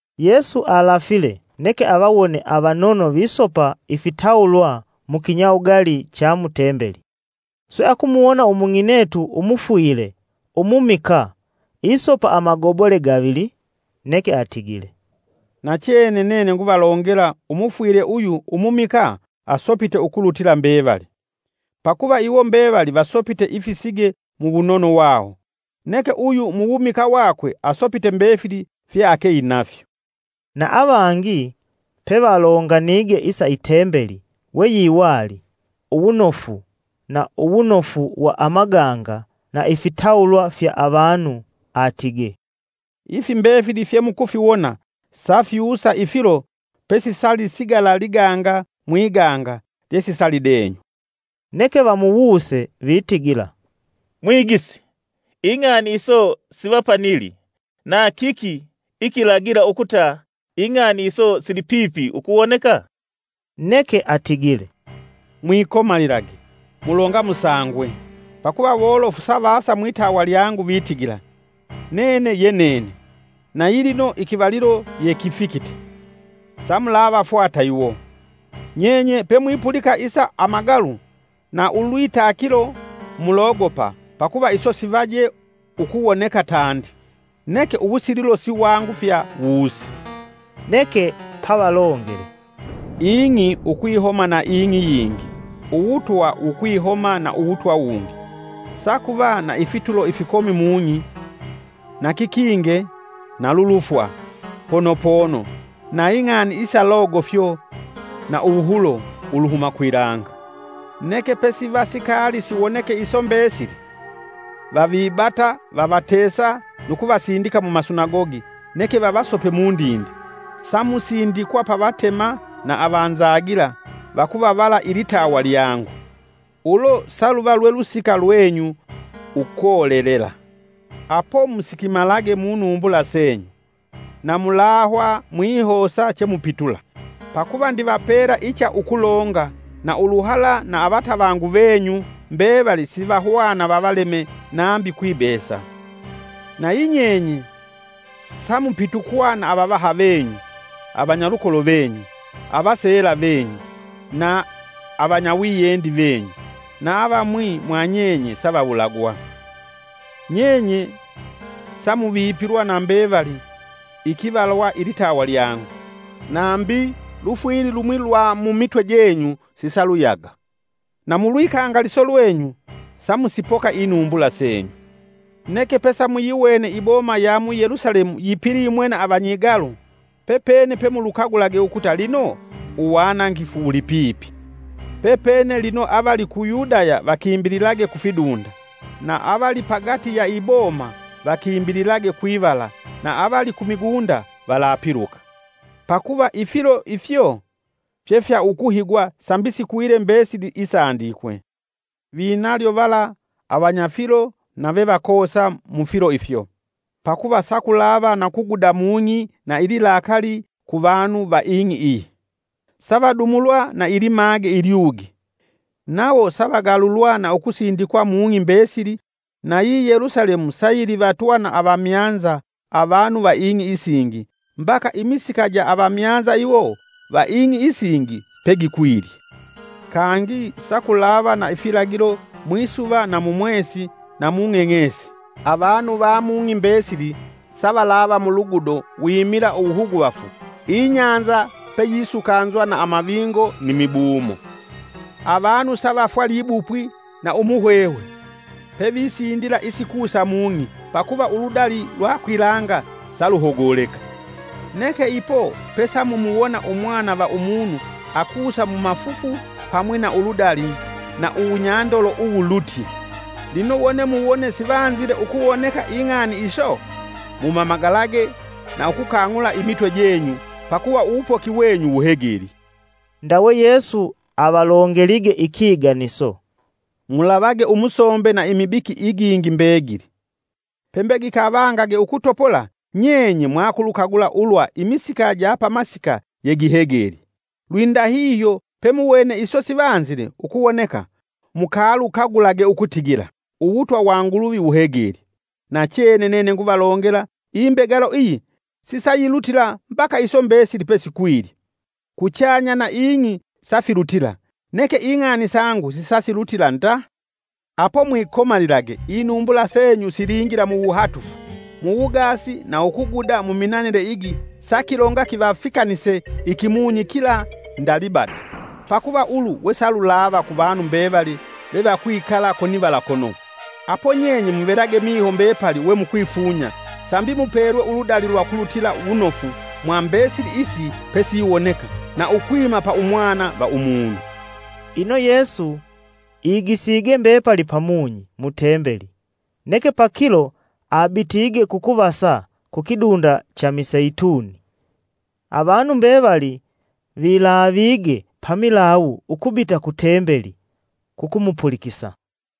Yesu alafile neke avawone avanono visopa ifitawulwa mukinyawugali cha mu Tembeli, swe akumuwona umung'inetu umufwile umumikaa isopa amagobole gavili. Neke atigile, “Nachene nene nguvalongela umufwile uyu umumikaa asopite ukulutila mbevali. Pakuva iwo mbevali vasopite ifisige mu wunono wawo, neke uyu mu wumikaa wakwe asopite mbefili fyeakeinafyo.” Na avangi pevalonganige isa Itembeli, we yiwali uwunofu na uwunofu wa amaganga na ifitawulwa fya avanu atige, “Ifi mbefili fye mukufiwona safyusa ifilo pesisalisigala liganga mwiganga lyesisalidenywa.” Neke vamuwuse vitigila, “Mwigisi ing'ani iso siva Panili, na kiki ikilagila ukuta ing'ani iso sili pipi ukuwoneka?” Neke atigile, “Mwikomalilage, mulonga musangwe. Pakuva wolofu savasa mwitawa lyangu vitigila, ‘Nene ye nene’, na yilino ikivalilo ye kifikite, samulavafwata iwo! Nyenye pemwipulika isa amagalu na ulwitakilo mulogopa pakuva iso sivaje ukuwoneka tandi, neke uwusililo siwangufya wuse.” Neke pavalongele: “Ing'i ukwihoma na ing'i yingi, uwutwa wukwihoma na uwutwa wungi. Sakuva na ifitulo ifikomi mung'i na kikinge na lulufo, pono pono na ing'ani isa logofyo na uwuhulo uluhuma kwilanga. Neke pesiva sikaali siwoneke iso mbesili, vavibata, vavatesa nu kuvasindika mumasinagogi neke vavasope mundinde; samusindikwa pa vatema na avanzagila vakuvavala lilitawa lyangu. Ulo saluva lwe lusika lwenyu ukolelela. Apo musikimalage munumbula senyu: na mulahwa mwihosa chemupitula, pakuva ndivapela icha ukulonga na uluhala, na avatavangu venyu mbevali sivahwana vavaleme nambi kwibesa. Nayi nyenye sa mupitukwa na avavaha venyu, avanyalukolo venyu, avaseela venyu, na avanyawiyendi venyu, na avamwi mwanyenye sa vawulagwa. Nyenye sa muvipilwa na mbevali ikivalwa lilitawa lyangu. Nambi, lufwili lumwi lwa mumitwe jenyu sisaluyaga. Na mulwikangaliso lwenyu, samusipoka inumbula senyu. “Neke pesamuyiwene iboma ya mu Yelusalemu yipilimwe na avanyigalu, pepene pemulukagulage ukuta lino uwanangifu wuli pipi. Pepene lino avali ku Yudaya vakimbililage kufidunda, na avali pagati ya iboma vakimbililage kwivala na avali ku migunda valapiluka. Pakuva ifilo ifyo fye fya ukuhigwa sambi sikwile mbesili isandikwe. Vinalyo vala avanyafilo na vevakoosa mufilo ifyo! Pakuva sakulava na kuguda mung'i na ililakali ku vanu va ing'i iyi; Savadumulwa na ilimage ilyugi, nawo savagalulwa na ukusindikwa mung'i mbesili nayi Yelusalemu sayilivatwa na avamyanza avanu va ing'i isingi mbaka imisika ja avamyanza iwo va ing'i isingi pegikwilye. “Kangi sakulava na ifilagilo mwisuva na mu mwesi na mu ng'eng'esi. Avanu va mung'i mbesili savalava mulugudo wimila uwuhuguvafu, ibahali peyisukanzwa na amavingo ni mibumo. Avanu savafwa libupwi na umuhwehwe, pevisindila isikusa mung'i pakuva uludali lwa kwilanga saluhogoleka. Neke ipo pesamumuwona Umwana va Umunu akusa mumafufu pamwi na uludali na uwunyandolo uwulutye. Lino wone muwone sivanzile ukuwoneka ing'ani iso, mumamagalage na ukukang'ula imitwe jenyu pakuva uwupoki wenyu wuhegelye.” Ndawe Yesu avalongelige ikiganiso: “Mulavage umusombe na imibiki igingi mbegili. Pembe gikavangage ukutopola, nyenye mwakulukagula ulwa imisika ja pamasika yegihegelye. Lwindahihyo, pemuwene iso sivanzile ukuwoneka, mukalukagulage ukutigila, uwutwa wa Nguluvi wuheglye. Nachene nene nguvalongela, imbegalo iyi sisayilutila mbaka iso mbesili pesikwilye. Kuchanya na ing'i safilutila, neke ing'ani sangu sisasilutila nda. “Apo mwikomalilage, inumbula senyu silingila muwuhatufu, mu wugaasi na ukuguda muminanile igi sakilonga kivafikanise ikimunyi kila nda libada. Pakuva ulu wesalulava ku vanu mbevali vevakwikala konivala kono. Apo nyenye muvelage miho mbepali we mukwifunya sambi mupelwe uludali lwa ukulutila wunofu mwa mbesili isi pesiwoneka, na ukwima pa Umwana va Umunu.” Ino Yesu igisige mbepali pamunyi mu tembeli, neke pakilo abitige kukuvasa kukidunda cha Miseituni. Avanu mbevali vilaavige pamilawu ukubita ku tembeli; kukumupulikisa.